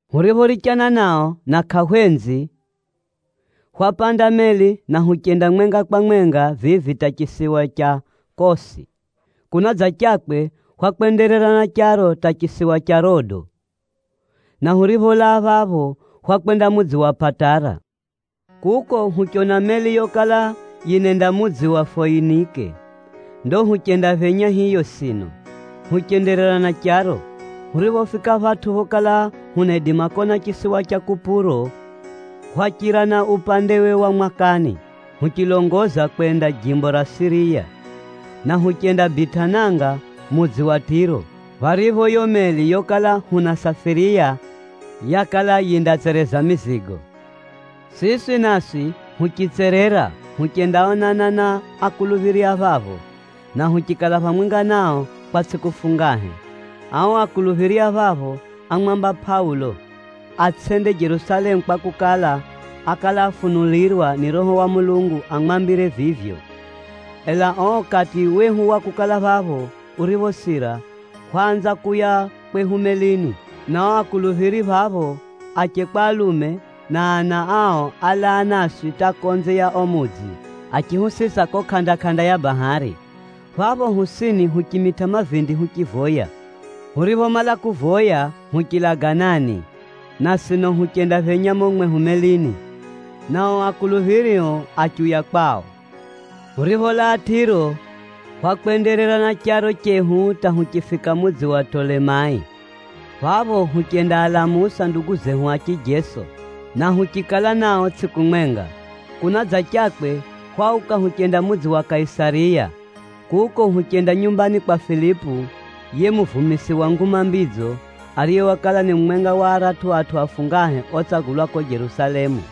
Huriphorichana nao na kʼahwenzi, hwapanda meli na huchenda mwenga kwa mwenga vivi hata chisiwa cha Kosi. Kunadzachakwe, hwakwenderera na charo hata chisiwa cha Rodo, na huripholaa phapho, hwakwenda mudzi wa Pʼatara. Kuko huchona meli yokala yinenda mudzi wa Foinike. Ndo huchendaphenya hiyo sino, huchenderera na charo. Huriphofika phatʼu phokala hunaidima kona chisiwa cha Kupuro, hwachira na upandewe wa mwakani, huchilongoza kwenda jimbo ra Siriya. Na huchendabitʼa nanga mudzi wa Tʼiro, pharipho yo meli yokala hunasafiriya yakala yindatsereza mizigo. Siswi naswi huchitserera huchendaonana na akuluphiri a phapho, na huchikala phamwenga nao kwa tsʼiku fungahe. Ao akuluphiri a phapho ámwamba Pʼaulo atsʼende Jerusalemu kwakukala, ákala afunulirwa ni Roho wa Mulungu amwambire vivyo. Ela o ukati wehu wa kukala phapho uriphosira, hwaanza kuuya kwehu melini, na o akuluphiri phapho, ache kwa alume, na ana ao álaa naswi hata konze ya o mudzi, achihusisa ko kʼanda-kʼanda ya bahari. Phapho hosini huchimitʼa mavindi huchivoya. Huriphomala kuvoya huchilaganani, na sino huchendaphenya mumo mwehu melini, na o akuluphiri o achiuya kwao. Huripholaa Tʼiro, hwakwenderera na charo chehu hata huchifika mudzi wa Tʼolemai. Phapho huchendaalamusa ndugu zehu a chijeso, na huchikala nao tsʼiku mwenga. Kunadzachakwe, hwauka huchenda mudzi wa Kaisariya. Kuko huchenda nyumbani kwa Filipu, yiye muvumisi wa Nguma Mbidzo, ariye wakala ni mumwenga wa aratʼu atʼu afungahe otsagulwa ko Jerusalemu.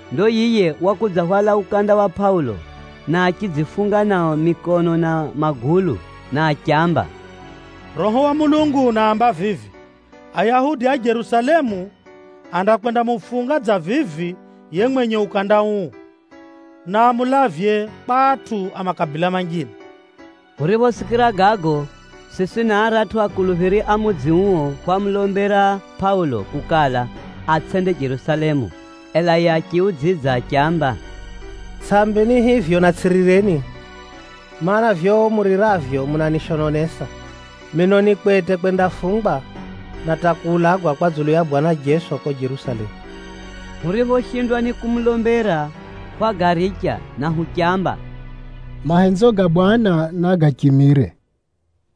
Ndo yiye wakudzahwala mukanda wa Pʼaulo, na achidzifunga nao mikono na magulu, na achiamba, “Roho wa Mulungu unaamba vivi, ‘Ayahudi a Jerusalemu andakwendamufunga dza vivi yiye mwenye mukanda uu, na amulavye kwa atʼu a makabila manjine!’” Huriphosikira gago, siswi na aratʼu akuluphiri a mudzi uo hwamulombera Pʼaulo kukala, atsʼende Jerusalemu. Ela yiye achihuudzidza achiamba, “Tsʼambeni hivyo, na tsʼirireni, mana, vivyo muriravyo munanishononesa. Mino ni kwete kwendafungwa, na hata kuulagwa kwa dzulu ya Bwana Jeso ko Jerusalemu.” Huriphoshindwa ni kumulombera, hwagaricha, na huchamba, “Mahenzo ga Bwana, nagachimire.”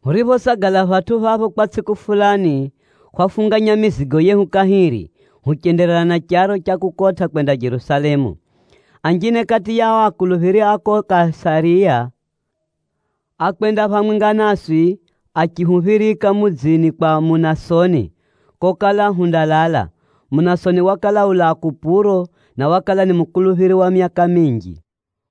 Huriphosagala phatʼu phapho kwa tsʼiku fulani, hwafunganya mizigo yehu kahiri, huchenderera na charo cha kukotʼa kwenda Jerusalemu. Anjine kati ya o akuluphiri a ko Kaisariya, ákwenda phamwenga naswi achihuphirika mudzini kwa Munasoni, kokala hundalala. Munasoni wakala ulaa Kupuro, na wakala ni mukuluphiri wa myaka minji.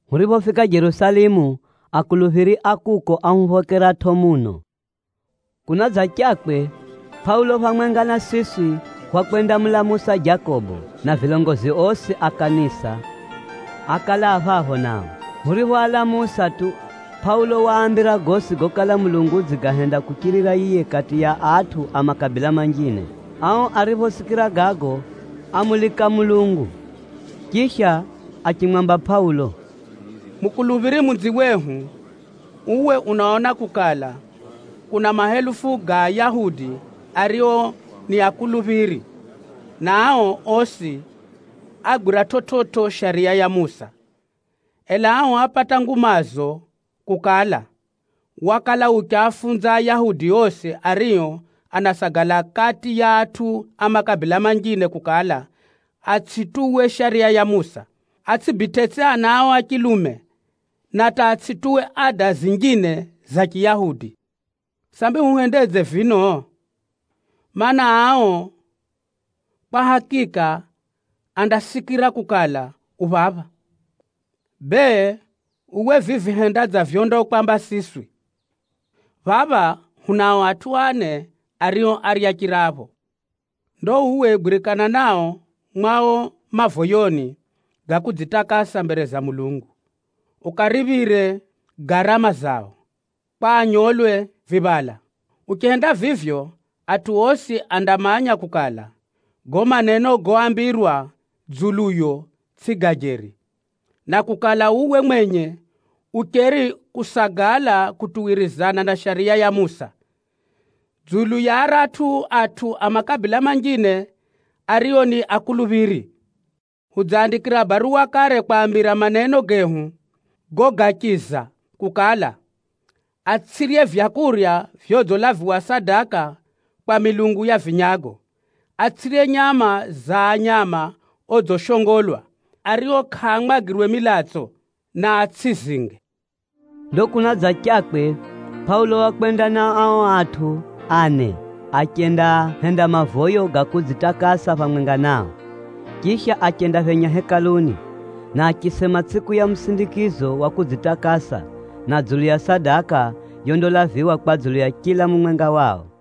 Huriphofika Jerusalemu, akuluphiri a kuko áhuphokeratʼo muno. Kunadzachakwe, Pʼaulo phamwenga na siswi hwakwendamulamusa Jakobo, na vilongozi osi a kanisa, ákala a phapho nao. Huriphoalamusa tu, Pʼaulo waambira gosi gokala Mulungu udzigahenda kuchirira yiye kati ya atʼu a makabila manjine. Ao ariphosikira gago, ámulika Mulungu. Chisha achimwamba Pʼaulo, “Mukuluphiri munziwehu, uwe unaona kukala, kuna mahelufu ga Ayahudi ario ni akuluphiri, na ao osi agwira chividzo Shariya ya Musa. Ela ao ápata ngumazo kukala, wakala uchiafunza Ayahudi osi ario anasagala kati ya atʼu a makabila manjine kukala, atsʼituwe Shariya ya Musa, atsʼibitʼetsʼi ana ao a chilume, na hata atsʼituwe ada zinjine za Chiyahudi. Sambi huhendedze vino? Maana, ao kwa hakika andasikira kukala, u phapha. Bee, uwe vivi henda dza vyondakwamba siswi. Phapha hunao atʼu ane ario árya chirapho. Ndo uwe gwirikana nao mwao mavoyoni ga kudzitakasa mbere za Mulungu, ukaariphire garama zao, kwa anyolwe viphala. Uchihenda vivyo, atʼu osi andamanya kukala, gago maneno goambirwa dzuluyo tsʼi ga jeri, na kukala uwe mwenye ucheri kusagala kutuwirizana na Shariya ya Musa. Dzulu ya aratʼu atʼu a makabila manjine ario ni akuluphiri, hudziaandikira baruwa kare kwaambira maneno gehu gogachiza kukala, atsʼirye vyakurya vyodzilaviwa sadaka kwa milungu ya vinyago, atsʼirye nyama za nyama odzishongolwa, ario kʼaamwagirwe milatso, na atsʼizinge.” Ndo kunadzachakwe, Pʼaulo wakwenda na ao atʼu ane achendahenda mavoyo ga kudzitakasa phamwenga nao. Chisha achendaphenya Hekaluni, na achisema tsʼiku ya musindikizo wa kudzitakasa, na dzulu ya sadaka yondalaviwa kwa dzulu ya chila mumwenga wao.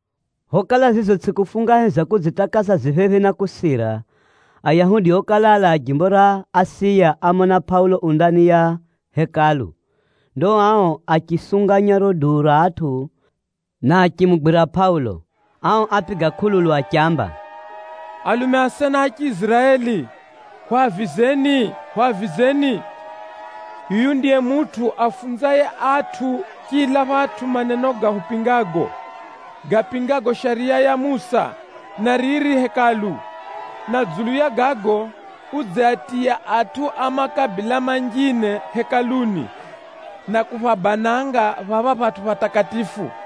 Phokala zizo tsʼiku fungahe za kudzitakasa zi phephi na kusira, Ayahudi okala alaa jimbo ra Asiya ámona Pʼaulo u ndani ya Hekalu. Ndo ao achisunganya riro duu ra atʼu, na achimugwira Pʼaulo. Ao ápiga kʼululu achiamba, “Alume asena a Chiiziraeli, hwavizeni, hwavizeni! Yuyu ndiye mutʼu aafunzaye atʼu chila phatʼu maneno gahupingago, gapingago Shariya ya Musa, na riri Hekalu. Na dzulu ya gago, udziatiya atʼu a makabila manjine Hekaluni, na kuphabananga phapha phatʼu phatakatifu.”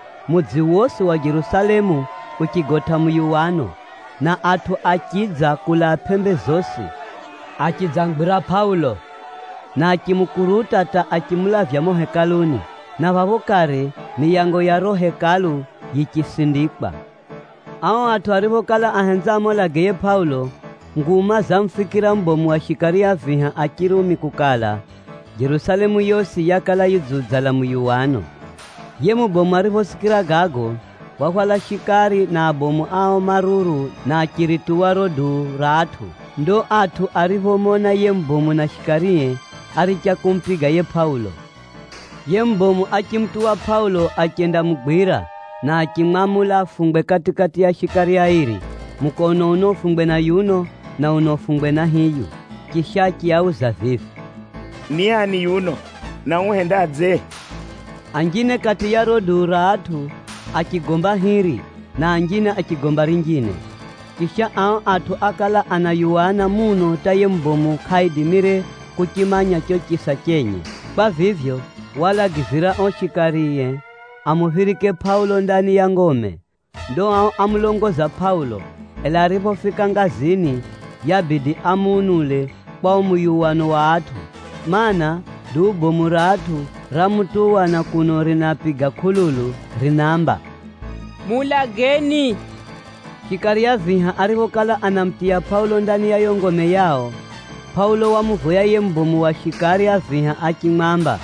Mudzi wosi wa Jerusalemu uchigotʼa muyuwano, na atʼu achidza kulaa pʼembe zosi, achidzamugwira Pʼaulo, na achimukuruta hata achimulavya mumo Hekaluni, na phapho kare miyango ya riro Hekalu yichisindikwa. Ao atʼu ariphokala ahenza amuulage yiye Pʼaulo, nguma zamufikira mubomu wa shikari a viha a Chirumi kukala, Jerusalemu yosi yakala yidziudzala muyuwano. Yiye mubomu ariphosikira gago, wahwala shikari na abomu ao maruru na achirituwa riro duu ra atʼu. Ndo atʼu ariphomona yiye mubomu na shikarie, áricha kumupiga yiye Pʼaulo. Yiye mubomu achimutuwa Pʼaulo achendamugwira, na achimwamula afungwe kati-kati ya shikari airi. Mukono uno ufungwe na yuno, na uno ufungwe na hiyu. Chisha achiauza vivi, “Ni ani yuno, na uhendadze?” Anjine kati ya riro duu ra atʼu achigomba hiri, na anjine achigomba rinjine. Chisha, ao atʼu ákala anayuwana muno hata yiye mubomu kʼaidimire kuchimanya cho chisa chenye. Kwa vivyo, waalagizira o shikarie amuphirike Pʼaulo ndani ya ngome. Ndo ao ámulongoza Pʼaulo, ela ariphofika ngazini, yaabidi amuunule kwa o muyuwano wa atʼu. Maana, duu bomu ra atʼu ramutuwa na kuno rinapiga kʼululu rinaamba, “Muulageni.” Shikari a viha ariphokala anamutiya Pʼaulo ndani ya yo ngome yao, Pʼaulo wamuvoya yiye mubomu wa shikari a viha achimwamba,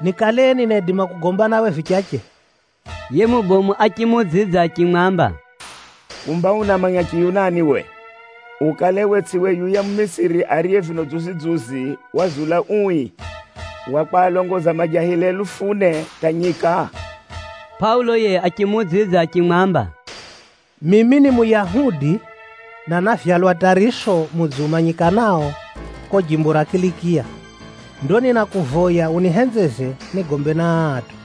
“Nikale ninaidima kugomba nawe vichache?” Yiye mubomu achimuudzidza achimwamba, “Kumba unamanya Chiyunani we? Ukale we tsʼiwe yuya Mumisiri ariye vino dzuzi-dzuzi wazula ui wa kwalongoza majahili helufu ne hata nyika?” Pʼaulo yiye achimuudzidza achimwamba, “Mimi ni Muyahudi, na návyalwa Tʼariso mudzi umanyikanao ko jimbo ra Kilikiya. Ndo ninakuvoya unihenzeze nigombe na aa atʼu.”